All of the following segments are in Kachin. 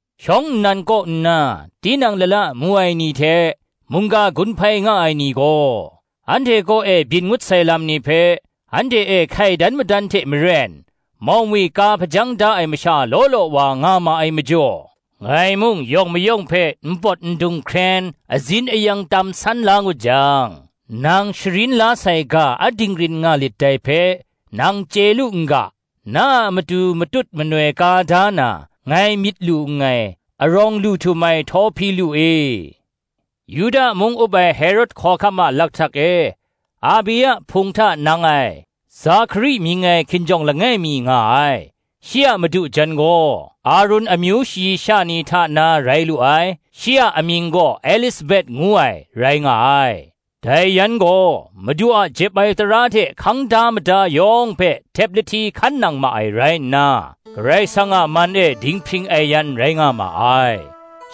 Shawng nnan kaw nna, tinang lala mu ai ni hte, mungga gun hpai nga ai ni gaw, anhte kaw e byin ngut sai lam ni hpe, anhte e hkai dan madan hte maren, maumwi ka hpajang da ai masha law law wa nga ma ai majaw: ngai mung yawng mayawng hpe npawt ndung hkren azin ayang tam san la ngut jang, nang sharin la sai ga a dinggrin nga lit dai hpe, nang chye lu n ga, na a matu matut manoi ka da na, ngai myit lu nngai, arawng lu htum ai Htawhpilu e. Yuda mung up ai Herod hkawhkam a lakhtak e, Abia hpung hta nang ai, Zakari mying ai hkinjawng langai mi nga ai; shi a madu jan gaw Arun amyu shayi sha ni hta na rai lu ai; shi a amying gaw Elisabet ngu ai, rai nga ai. Dai yan gaw, Madu a jep ai tara hte hkang da mada yawng hpe htep lahti hkan nang ma ai rai nna, Karai Kasang a man e dinghpring ai yan rai nga ma ai.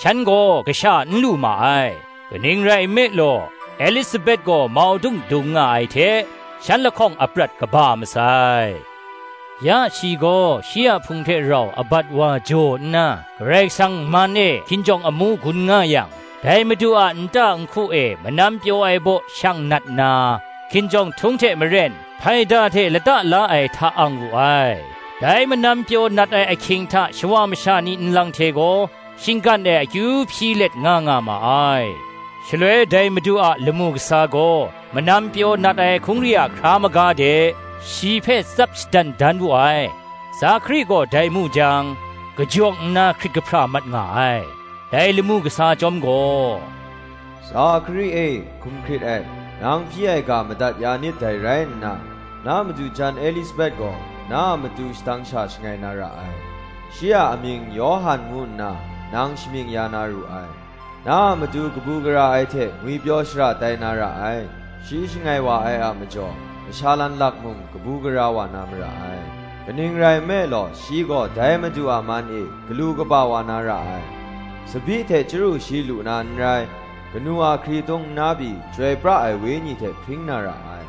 Shan gaw kasha n lu ma ai; kaning rai nme law, Elisabet gaw maudung dung nga ai hte, shan lahkawng aprat kaba masai. Ya shi gaw, shi a hpung hte rau abat wa ang nna, Karai Kasang man e hkinjawng amu gun nga yang, dai Madu a nta nhku e manam pyaw ai baw shang nat na, hkinjawng htung hte maren, hpaida hte lata la ai hta ang wu ai. Dai manam pyaw nat ai ahkying hta shawa masha ni nlang hte gaw, shinggan e akyu hpyi let nga nga ma ai. Shaloi dai Madu a lamu kasa gaw, manam pyaw nat ai hkungri a hkra maga de, shi hpe tsap shadan dan wu ai. Zakari gaw dai mu jang kajawng nna hkrit kahpra mat nga ai. Dai lamu kasa chyawm gaw, “Zakari e, hkum hkrit et; nang hpyi ai ga madat ya nit dai rai nna, na madu jan Elisabet gaw na a matu shadang sha shangai na ra ai; shi a amying Yawhan ngu nna, nang shamying ya na ru ai; Na a matu kabu gara ai hte ngwipyaw shara tai na ra ai; shi shangai wa ai a majaw masha lanlak mung, kabu gara wa na mara ai. Kaning rai nme law, shi gaw dai Madu a man e galu kaba wa na ra ai; tsabyi hte chyaru shi lu na n rai; kanu a hkritung nna pyi, Chyoi pra ai Wenyi hte hpring na ra ai.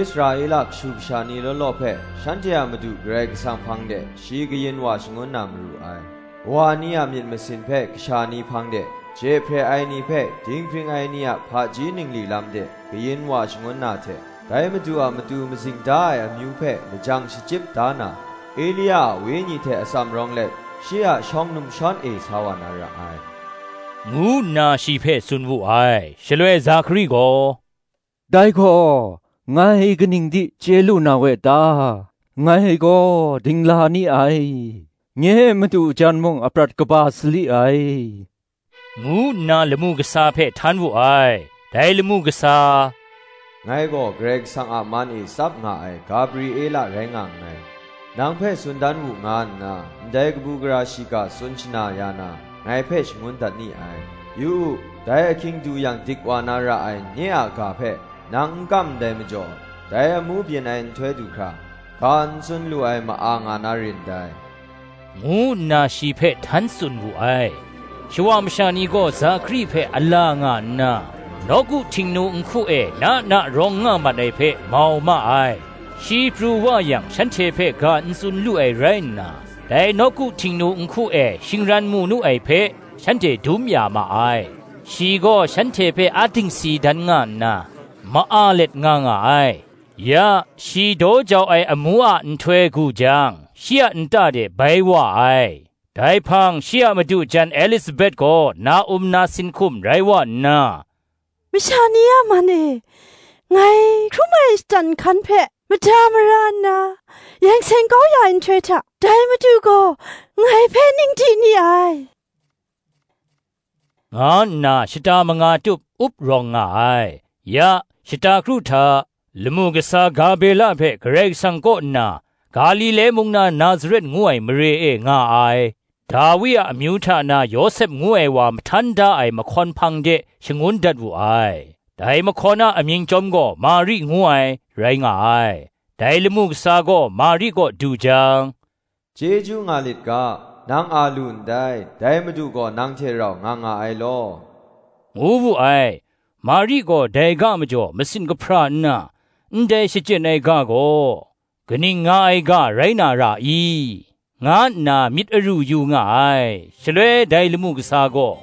Israela kashu kasha ni law law hpe, shanhte a Madu Karai Kasang hpang de shi kayin wa shangun na maru ai. Kawa ni a myit masin hpe kasha ni hpang de, je hpre ai ni hpe dinghpring ai ni a hpaji ningli lam de kayin wa shangun na hte, dai Madu a matu mazing da ai amyu hpe lajang shachyip da na, Elia a wenyi hte atsam rawng let, shi a shawng numshawn e sa wa na ra ai,” ngu nna shi hpe tsun wu ai. Shaloi Zakari gaw, “Dai gaw ngai kaning di chye lu na we ta? ngai gaw dingla ni ai, nye madu jan mung aprat kaba sali ai,” ngu nna lamu kasa hpe htan wu ai. Dai lamu kasa, “Ngai gaw Karai Kasang a man e tsap nga ai Gabriela rai nga nngai; nang hpe tsun dan wu nga nna, ndai kabu gara shiga tsun shana ya na, ngai hpe shangun dat ni ai. Yu u, dai ahkying du yang dik wa na ra ai nye a ga hpe, nang n kam ndai majaw, dai amu byin ai nhtoi du hkra, ga n tsun lu ai ma-a nga na rin dai,” ngu nna shi hpe htan tsun wu ai. Shawa masha ni gaw Zakari hpe a la nga nna, nawku Htingnu nhku e na na rawng nga mat ai hpe, mau ma ai. Shi pru wa yang shanhte hpe ga n tsun lu ai rai nna, dai nawku Htingnu nhku e shingran mu nu ai hpe, shanhte dum ya ma ai: shi gaw shanhte hpe a dingsi dan nga nna, ma-a let nga nga ai. Ya, shi daw jau ai amu a nhtoi gu jang, shi a nta de bai wa ai. Dai hpang shi a madu jan Elisabet gaw na-um nasin hkum rai wa nna, Masha ni a man e ngai hkrum ai shatan nhkan hpe, mada mara nna yeng seng kau ya ai nhtoi hta, dai Madu gaw ngai hpe ning di ni ai, nga nna shata manga tup up rawng nga ai. Ya, shata kru hta, lamu kasa Gabriela hpe Karai Kasang kaw nna, Galile mung na Nazaret ngu ai mare e nga ai, Dawi amyu hta na Yawsep ngu ai wa mahtan da ai mahkawn hpang de shangun dat wu ai: dai mahkawn a amying chyawm gaw Mari ngu ai, rai nga ai. Dai lamu kasa gaw Mari kaw du jang, “Chyeju nga lit ga, nang a lu ndai, dai Madu gaw nang hte rau nga nga ai law,” ngu wu ai. Mari gaw dai ga majaw masin kahpra nna, ndai shachyen ai ga gaw, kaning nga ai ga rai na ra i? nga nna myit aru yu nga ai. Shaloi dai lamu kasa gaw,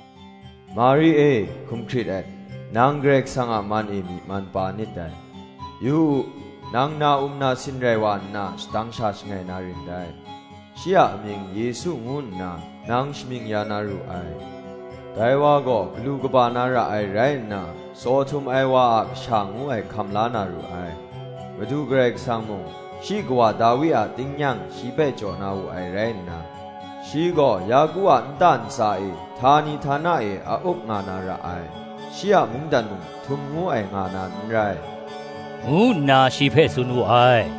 “Mari e, hkum hkrit et; nang Karai Kasang a man e myi man pa nit dai: yu u, nang na-um nasin rai wa nna shadang sha shangai na rin dai; shi a amying Yesu ngu nna, nang shamying ya na ru ai. Dai wa gaw galu kaba na ra ai rai nna, Tsaw htum ai wa a Kasha ngu ai hkam la na ru ai; Madu Karai Kasang mung, shi kawa Dawi a tingnyang, shi hpe jaw na wu ai rai nna, shi gaw Yaku a nta ntsa e, htani htana e a up nga na ra ai: shi a mungdan mung htum ngu ai nga na n rai,” ngu nna shi hpe tsun wu ai.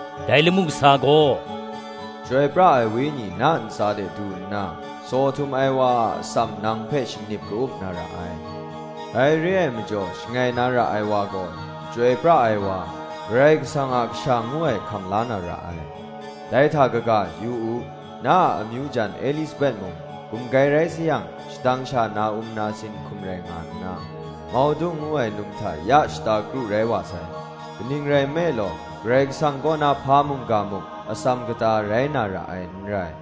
Dai lamu kasa gaw, “Chyoi pra ai Wenyi na ntsa de du nna, Tsaw htum ai wa a atsam nang hpe shingnip ka-up na ra ai; dai re ai majaw shangai na ra ai wa gaw, Chyoi pra ai wa, Karai Kasang a Kasha ngu ai hkam la na ra ai. Dai hta kaga, yu u, na a amyu jan Elisabet mung, gumgai rai sayang shadang sha na-um nasin hkum rai nga nna, maudung ngu ai num hta ya shata kru rai wa sai: kaning rai nme law, Karai Kasang kaw na hpa mungga muk, atsam kata rai na ra ai n rai,”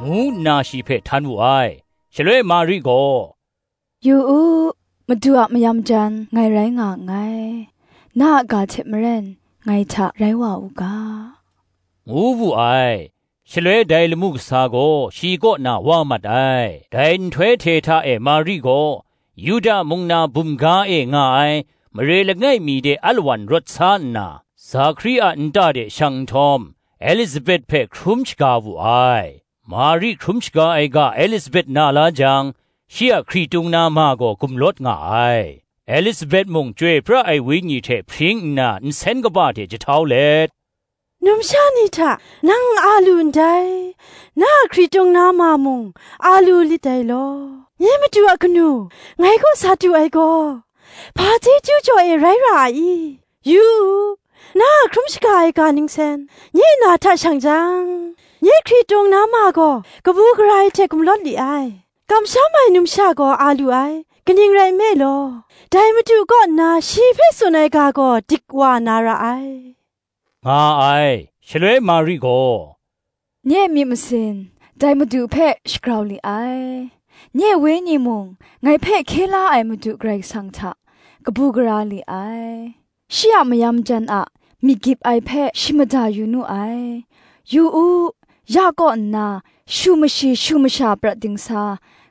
ngu nna shi hpe htan wu ai. Shaloi Mari gaw, “Yu u, Madu a mayam jan ngai rai nga nngai; na a ga hte maren ngai hta rai wa u ga,” ngu wu ai. Shaloi dai lamu kasa gaw shi kaw na wa mat ai. Dai nhtoi hte hta e Mari gaw, Yuda mung na bum ga e nga ai mare langai mi de alawan rawt sa nna, Zakari a nta de shang nhtawm, Elisabet hpe hkrum shaga wu ai. Mari hkrum shaga ai ga Elisabet na la jang, shi a hkritung na ma gaw gumlawt nga ai: Elisabet mung Chyoi pra ai Wenyi hte hpring nna nsen kaba hte jahtau let, “Numsha ni hta nang a lu ndai; na a hkritung na ma mung a lu lit dai law. Nye Madu a kanu ngai kaw sa du ai gaw, hpa chyeju jaw e rai ra ai i? Yu u, na a hkrum shaga ai ga nsen nye na hta shang jang, nye hkritung na ma gaw kabu gara ai hte gumlawt li ai. Kamsham ai numsha gaw a lu ai; kaning rai nme law, dai Madu kaw nna shi hpe tsun ai ga gaw dik wa na ra ai,” nga ai. Shaloi Mari gaw, “Nye myit masin dai Madu hpe shagrau li ai; Nye wenyi mung ngai hpe hkye la ai Madu Karai Kasang hta kabu gara li ai. Shi a mayam jan a myit gyip ai hpe shi mada yu nu ai; Yu u, ya kaw nna shu mashi shu masha prat dingsa,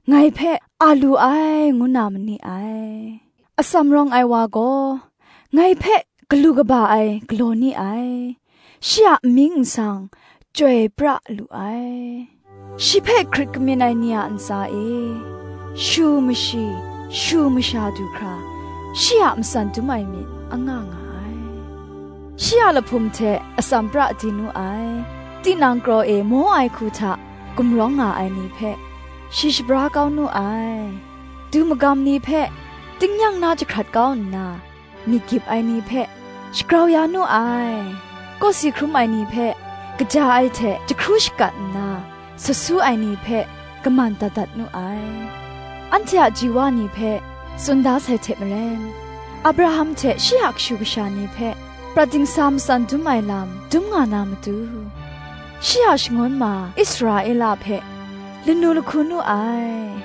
ngai hpe a lu ai, ngu na ma ni ai. Atsam rawng ai wa gaw, ngai hpe galu kaba ai galaw ni ai; Shi a amying nsang chyoi pra lu ai: Shi hpe hkrit kamyin ai ni a ntsa e, shu mashi shu masha du hkra, Shi a matsan dum ai myit anga nga ai. Shi a lahpum hte atsam pra di nu ai; Tinang kraw e maw ai hku hta gumrawng nga ai ni hpe, shi shabra kau nu ai. Du magam ni hpe tingnyang na jahkrat kau nna, myit gyip ai ni hpe shagrau ya nu ai. Kawsi hkrum ai ni hpe kaja ai hte jahkru shakat nna, sut su ai ni hpe kaman dat dat nu ai. Anhte a ji wa ni hpe tsun da sai hte maren, Abraham hte shi a kashu kasha ni hpe, Prat dingsa matsan dum ai lam dum nga na matu, Shi a shangun ma Israela hpe lanu lahku nu ai,”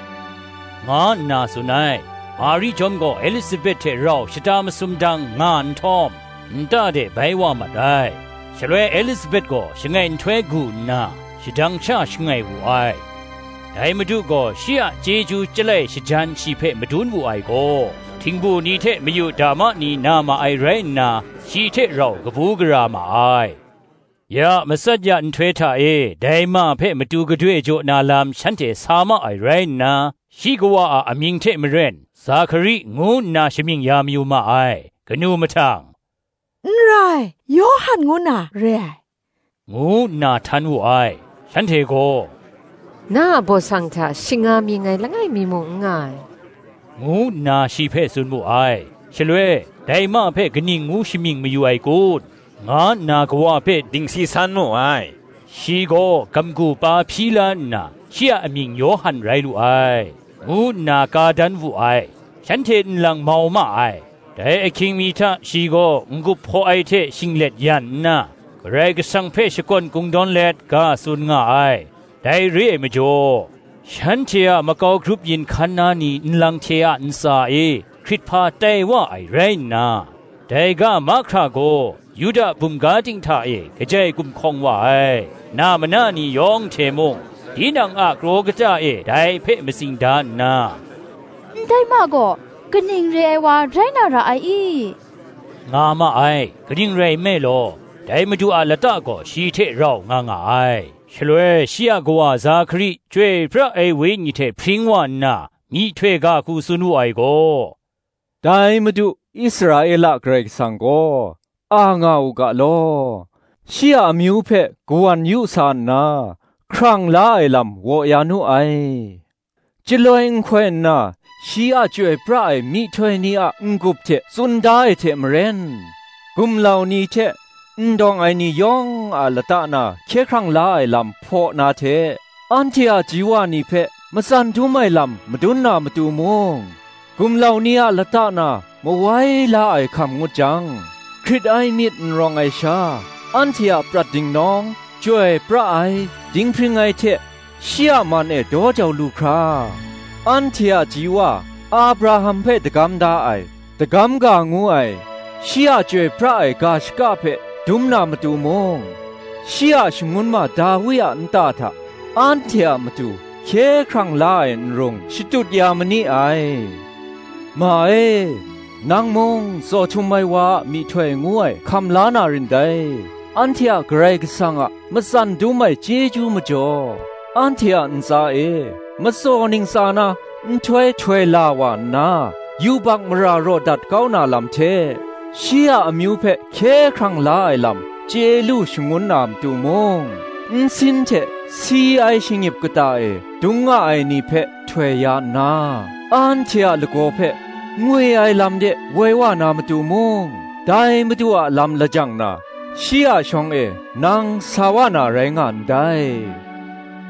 nga nna tsun ai. Mari chyawm gaw Elisabet hte rau shata masum dang nga nhtawm, nta de bai wa mat ai. Shaloi Elisabet gaw shangai nhtoi gu nna, shadang sha shangai wu ai. Dai Madu gaw shi a chyeju chyalai shajan shi hpe madun wu ai gaw, htingbu ni hte mayu dama ni na ma ai rai nna, shi hte rau kabu gara ma ai. Ya matsat ya nhtoi hta e dai ma hpe matu gadoi jaw na lam shanhte sa ma ai rai nna, shi kawa a amying hte maren, Zakari, ngu nna shamying ya mayu ma ai. Kanu mahtang, “N rai, Yawhan ngu na re ai,” ngu nna htan wu ai. Shanhte gaw, “Na a baw sang hta shing nga mying ai langai mi muk n nga ai,” ngu nna shi hpe tsun mu ai. Shaloi, dai ma hpe kaning ngu shamying mayu ai kun? nga nna kawa hpe dingsi san mu ai. Shi gaw gamgu pa hpyi la nna, “Shi a amying Yawhan rai lu ai,” ngu nna ka dan wu ai. Shanhte nlang mau ma ai. Dai ahkring mi hta shi gaw n-gup hpaw ai hte shinglet yan nna, Karai Kasang hpe shakawn kungdawn let ga tsun nga ai. Dai re ai majaw, shanhte a makau grup yin hkan na ni nlang hte a ntsa e hkrithpa tai wa ai rai nna, dai ga mahkra gaw, Yuda bum ga ting hta e kajai gumhkawng wa ai. Na mana ni yawng hte mung, tinang a kraw kata e dai hpe matsing da nna, “Ndai ma gaw, kaning re ai wa rai na ra ai i?” nga ma ai: kaning rai nme law, dai Madu a lata gaw shi hte rau nga nga ai. Shaloi shi a kawa Zakari Chyoi pra ai Wenyi hte hpring wa nna, myihtoi ga hku tsun wu ai gaw, “Dai Madu, Israela Karai Kasang gaw, a nga u ga law; Shi a amyu hpe kawan yu sa nna, hkrang la ai lam waw ya nu ai. Chyaloi nhkoi nna shi a chyoi pra ai myihtoi ni a n-gup hte tsun da ai hte maren, Gumlau ni hte n dawng ai ni yawng a lata na hkye hkrang la ai lam hpaw na hte, Anhte a ji wa ni hpe matsan dum ai lam madun na matu mung; Gumlau ni a lata na mawai la ai hkam ngut jang, Hkrit ai myit n rawng ai sha, anhte a prat dingnawng, Chyoi pra ai, dinghpring ai hte, shi a man e daw jau lu hkra, Anhte a ji wa Abraham hpe dagam da ai, dagam ga ngu ai, Shi a chyoi pra ai ga shaka hpe dum na matu mung, Shi a shangun ma Dawi a nta hta, anhte a matu, Hkye hkrang la ai nrung shatut ya ma ni ai. Ma e, nang mung, Tsaw htum ai Wa a myihtoi ngu ai hkam la na rin dai: Anhte a Karai Kasang a matsan dum ai chyeju majaw, Anhte a ntsa e Matsaw ntsa na nhtoi htoi la wa nna, Yubak mara raw dat kau na lam hte, Shi a amyu hpe hkye hkrang la ai lam chye lu shangun na matu mung, Nsin, hte si ai shingnip kata e dung nga ai ni hpe htoi ya nna, Anhte a lagaw hpe ngwi ai lam de woi wa na matu mung, Dai Madu a lam lajang na, shi a shawng e nang sa wa na rai nga ndai,”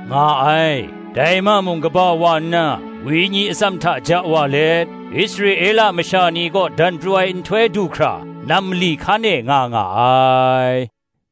nga ai. Dai ma mung kaba wa nna, wenyi atsam hta ja wa let, Israela masha ni kaw dan pru ai nhtoi du hkra, nam mali hkan e nga nga ai.